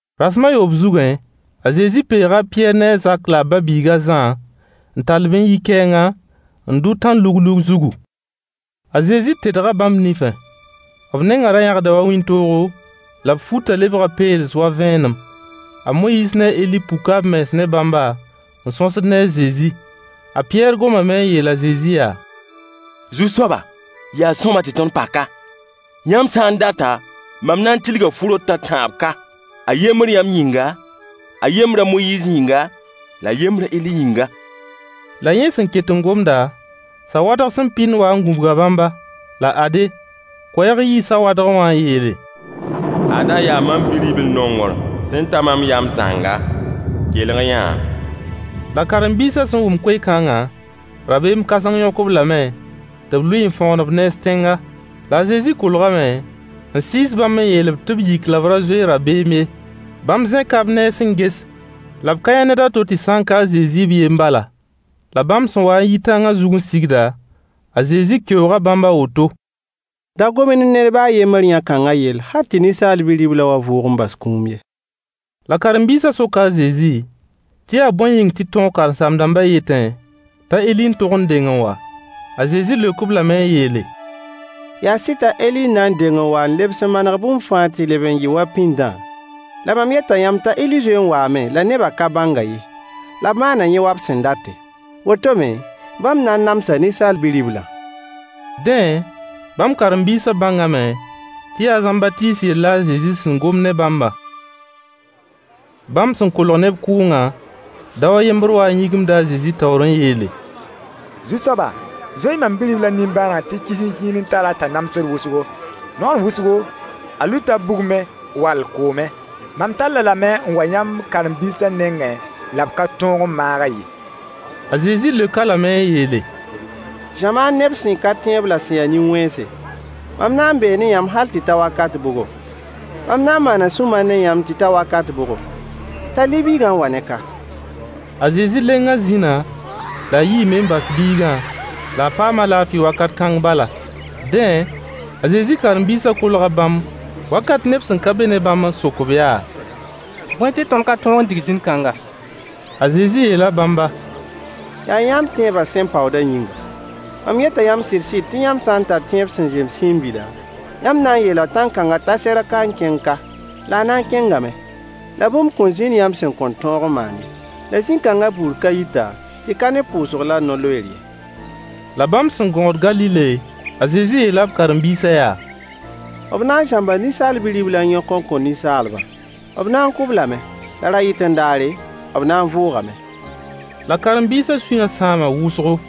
Rasem a yoob zugẽ, a Zezi peega a Pɩyɛɛr ne a Zak la a ba-biig a Zã n tall-b n yi kɛɛnga, n dʋ tãn-luglug zugu. A Zezi tedga bãmb nifẽ. B nengã ra yãgda wa wĩntoogo, la b futã lebga peels wa vẽenem. A Moyiis ne a Eli puka b mens ne bãmba n sõsd ne a Zezi. A Pɩyɛɛr gomame n yeel a Zezi yaa: Zu-soaba! Yaa sõama tɩ tõnd pa ka. Yãmb sã n data, mam na n tilga fu-rot a tãab ka: a yembr yãmb yĩnga, a yembr a Moyiis yĩnga, la a yembr a Eli yĩnga. La yẽ sẽn ket n gomda, sawadg sẽn pɩnd wa n gũbga bãmba. La ade, koɛɛg yii sawadgẽ wã n yeele: Ada yaa mam Bi-ribl-nongr sẽn ta mam yam zãnga. Kelg-y-yã-a. La karen-biisã sẽn wʋm koe-kãngã, rabeem kãseng yõk-b lame tɩ b lʋɩ n fõgen b nens tẽnga. La a Zezi kolgame n sɩɩs bãmb n yeel-b tɩ b yik la b ra zoe dabeem ye. Bãmb zẽka b nens n ges la b ka yã ned a to tɩ sã n ka a Zezi b yen bala. La bãmb sẽn wa n yi tãngã zug n sigda, a Zezi keooga bãmb a woto: Da gom-y ne ned ba a yembr yã-kãngã yell hal tɩ Ninsaal Bi-riblã wa vʋʋg n bas kũum ye. La karen-biisã soka a Zezi tɩ yaa bõe yĩng tɩ tõog karen-saam-dãmbã yetẽ t'a Eli n tog n deng n wa? A Zezi leok-b lame n yeele: Yaa sɩd t'a Eli na n deng n waa n lebs n manega bũmb fãa tɩ leb n yɩ wa pĩndã. La mam yeta yãmb t'a Eli zoe n waame la neba ka bãng-a ye, la b maana yẽ wa b sẽn date. Woto me, bãmb na n namsa Ninsaal Bi-riblã. Dẽ, bãmb karen-biisã bãngame tɩ yaa a Zãmbatiis yell la a Zezi sẽn gom ne bãmbã. Bãmb sẽn kolg neb kʋʋngã, dao a yembr waa n yĩgimda a Zezi taoor n yeele: Zu-soaba, zoe-y mam bi-riblã nimbãaneg tɩ kisĩnkĩir n tar-a t'a namsd wʋsgo. Naoor wʋsgo, a lʋɩta bugmẽ wall koomẽ. Mam tall-a lame n wa yãmb karen-biisã nengẽ la b ka tõog n maag-a ye. A Zezi leok-a lame n yeele: Zamaan neb sẽn ka tẽeb la sẽn ya nin-wẽnse! Mam na n bee ne yãmb hal tɩ ta wakat bʋgo? Mam na n maana sũ-mar ne yãmb tɩ ta wakat bʋgo? Tall-y biigã n wa-ne ka. A Zezi lenga zĩna, la a yiime n bas biigã, la a paama laafɩ wakat kãng bala. Dẽ, a Zezi karen-biisã kolga bãmb wakat neb sẽn ka be ne bãmba n sok-b yaa: Bõe tɩ tõnd ka tõog n dig zĩn-kãngã? A Zezi yeela bãmba: Yaa yãmb tẽebã sẽn paoodã yĩnga. Mam yeta yãmb sɩd-sɩd tɩ yãmb sã n tar tẽeb sẽn zem siin-bila, yãmb na n yeela tãn-kãngã t'a serg ka n kẽng ka, la a na n kẽngame. La bũmb kõn zĩnd yãmb sẽn kõn tõog n maan ye. [ La zĩn-kãngã buud ka yita, tɩ ka ne pʋʋsg la no-loeer ye.] La bãmb sẽn gõod Galile, a Zezi yeela b karen-biisã yaa: B na n zãmba Ninsaal Bi-riblã n yõk n kõ ninsaalbã. B na n kʋʋ-b lame, la ra-yɩt-n-daare, b na n vʋʋgame. La karen-biisã sũyã sãama wʋsgo.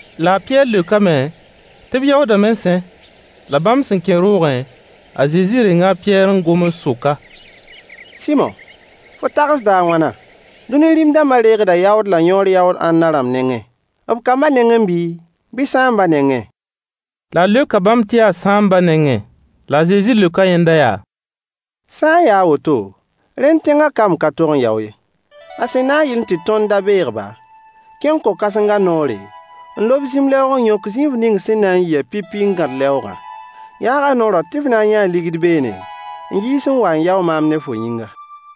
La a Pɩyɛɛr leokame tɩ b yaoodame sẽ! La bãmb sẽn kẽ roogẽ, a Zezi renga a Pɩyɛɛr n gom n sok-a: Sɩmo! Fo tagsda a wãna? Dũni rĩm-dãmba deegda yaood la yõor yaood ãnna rãmb nengẽ? B kamba nengẽ bii, bɩ sãambã nengẽ? La a leoka bãmb tɩ yaa sãambã nengẽ. La a Zezi leoka yẽnda yaa: Sã n ya a woto, rẽnd tẽngã kamb ka tog n yao ye. La sẽn na yɩl tɩ tõnd da beeg-ba, kẽng ko-kãsengã noore, n lob zĩm-lɛoog n yõk zĩif ning sẽn na n yɩ-a pipi n gãd lɛoogã. Yaag a noorã tɩ f na n yãa ligd beene n yiis n wa n yao maam ne fo yĩnga.